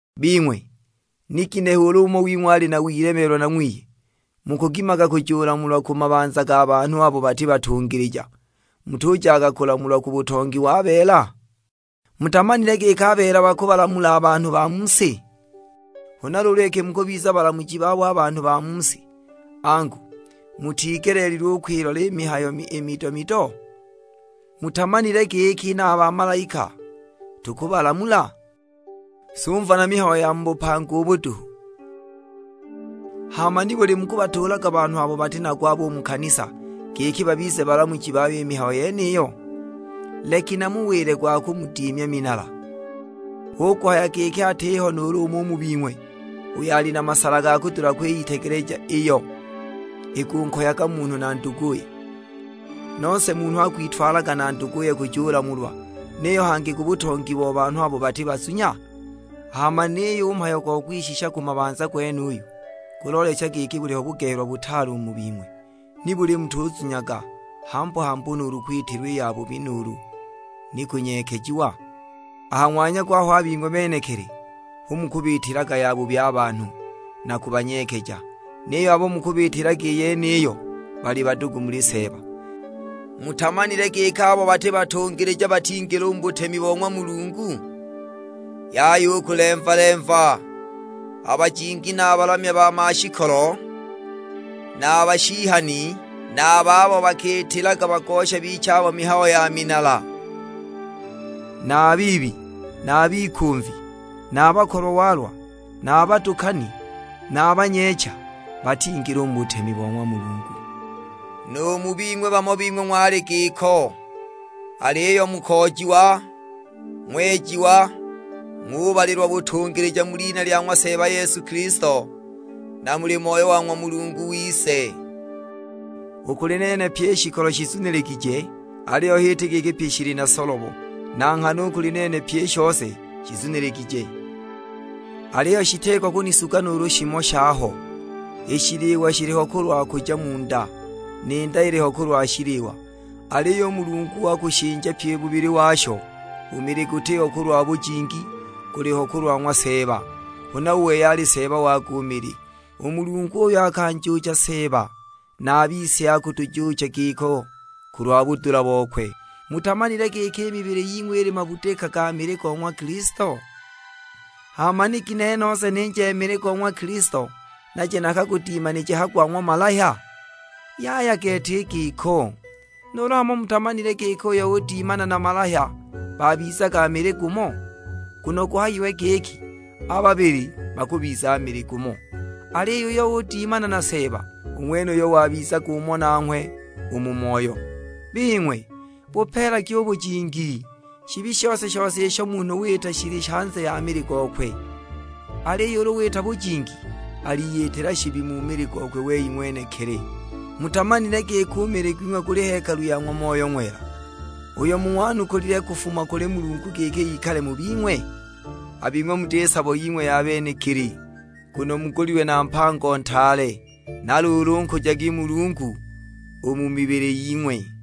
Bing'we, ni ginehe ulu umo wing'we ali na wilemeelwa na ng'wiye mukugimaga kujulamulwa ku mabanza ga banhu abo bati batungilija, mutujaga kulamulwa ku butongi wa beela? Mutamanile giki a beela bakubalamula a banhu ba mu si? Huna luulu iki mukubiza balamuji babo a banhu ba mu si, angu, mutigeleelilwe u kwilola i mihayo i mido-mido? Mutamanile giki na a bamalaika tukubalamula? Sumva na mihayo ya mu bupanga ubu duhu! Hama nibuli mukubatuulaga banhu abo bati na gwabo u mu kanisa giki babize balamuji bayo i mihayo yeniyo? Leki namuwile gwa kumudimya minala: hu kuhaya giki atiho nuulu umo u mu bing'we uyo ali na masala ga kudula kwiyitegeleja iyo ikunkoyaga munhu na nduguye; nose munhu akwitwalaga na nduguye kujulamulwa, niyo hangi ku butongi bo banhu abo bati bazunya? Hama niyo u mhayo gwa kwishisha ku mabanza gwenuyu, guloolecha giki buliho bugehelwa butaale u mu bing'we! Nibuli mutuzunyaga hambu-hambu nuulu kwitilwa i yabubi; nuulu ni kunyeekejiwa? A ha ng'wanya gwaho a bing'we benekili hu mukubiitilaga yabubi a banhu, na kubanyeekeja: niyo abo mukubiitilaga i yeniyo bali badugu muli Seeba! Mutamanile giki abo bati batungilija batingila u mu butemi bo ng'wa Mulungu? Yaya u kulemva-lemva; a bajingi na a balamya ba mashikolo, na a bashihani, na a bagosha abo bakiyitaga kubiza giti bakima, na a babo bakiitilaga bagosha bichabo mihayo ya minala; na a biibi, na a bikumvi, na a bakolwa-walwa, na a badukani, na a banyeecha: batingila u mu butemi bo ng'wa Mulungu. Nu mu bing'we bamo bing'we ng'wali giko, aliyo mukoojiwa, ng'wejiwa, ng'ubalilwa butungilija mu lina lya ng'wa Seeba Yesu Kilisto, na muli Moyo wa ng'wa Mulungu wise. "U kuli nene pyi i shikolo shizuniligije," aliyo h'iti giki pyi shili na solobo. "Na nghana u kuli nene pyi i shose shizuniligije," aliyo shitiko kunisuga nuulu shimo shaho. "I shiliwa shiliho kulwa kuja mu nda, ni nda iliho kulwa shiliwa," aliyo u Mulungu akushinja pyi bubili washo. U mili gutiho kulwa bujingi, guliho kulwa ng'wa Seeba; huna u wei ali Seeba wago u mili. U Mulungu uyo akanjuucha Seeba, na a bise akutujuucha giko, kulwa budula bokwe. Mutamanile giki i mibili ying'we ili mabudika ga mili go ng'wa Kilisto? Hama ni ginehe nose ninje mili go ng'wa Kilisto naje nakagudimanije ha gwa ng'wa malahya? Yaya gete i giko! Nuulu hamo mutamanile giki uyo udimana na malahya babizaga mili gumo? Nguno guhayiwe giki, "A babili bakubiza mili gumo." Aliyo uyo udimana na Seeba, u ng'wenuyo wabizaga umo nanghwe u mu moyo. Bing'we, bupeelagi u bujingi; shibi shose-shose isho munhu wita shili hanze ya mili gokwe, aliyo ulu wita bujingi, aliyitila shibi mu mili gokwe wei ng'wenekili. Mutamanile giki u mili gwing'we guli hekalu ya ng'wa Moyo Ng'wela, uyo mung'wanukulile kufuma kuli Mulungu giki ikale mu bing'we? A bing'we muti sabo ying'we ya benekili. Nguno mugulilwe na mpango ntaale; na luulu nkujagi Mulungu u mu mibili ying'we.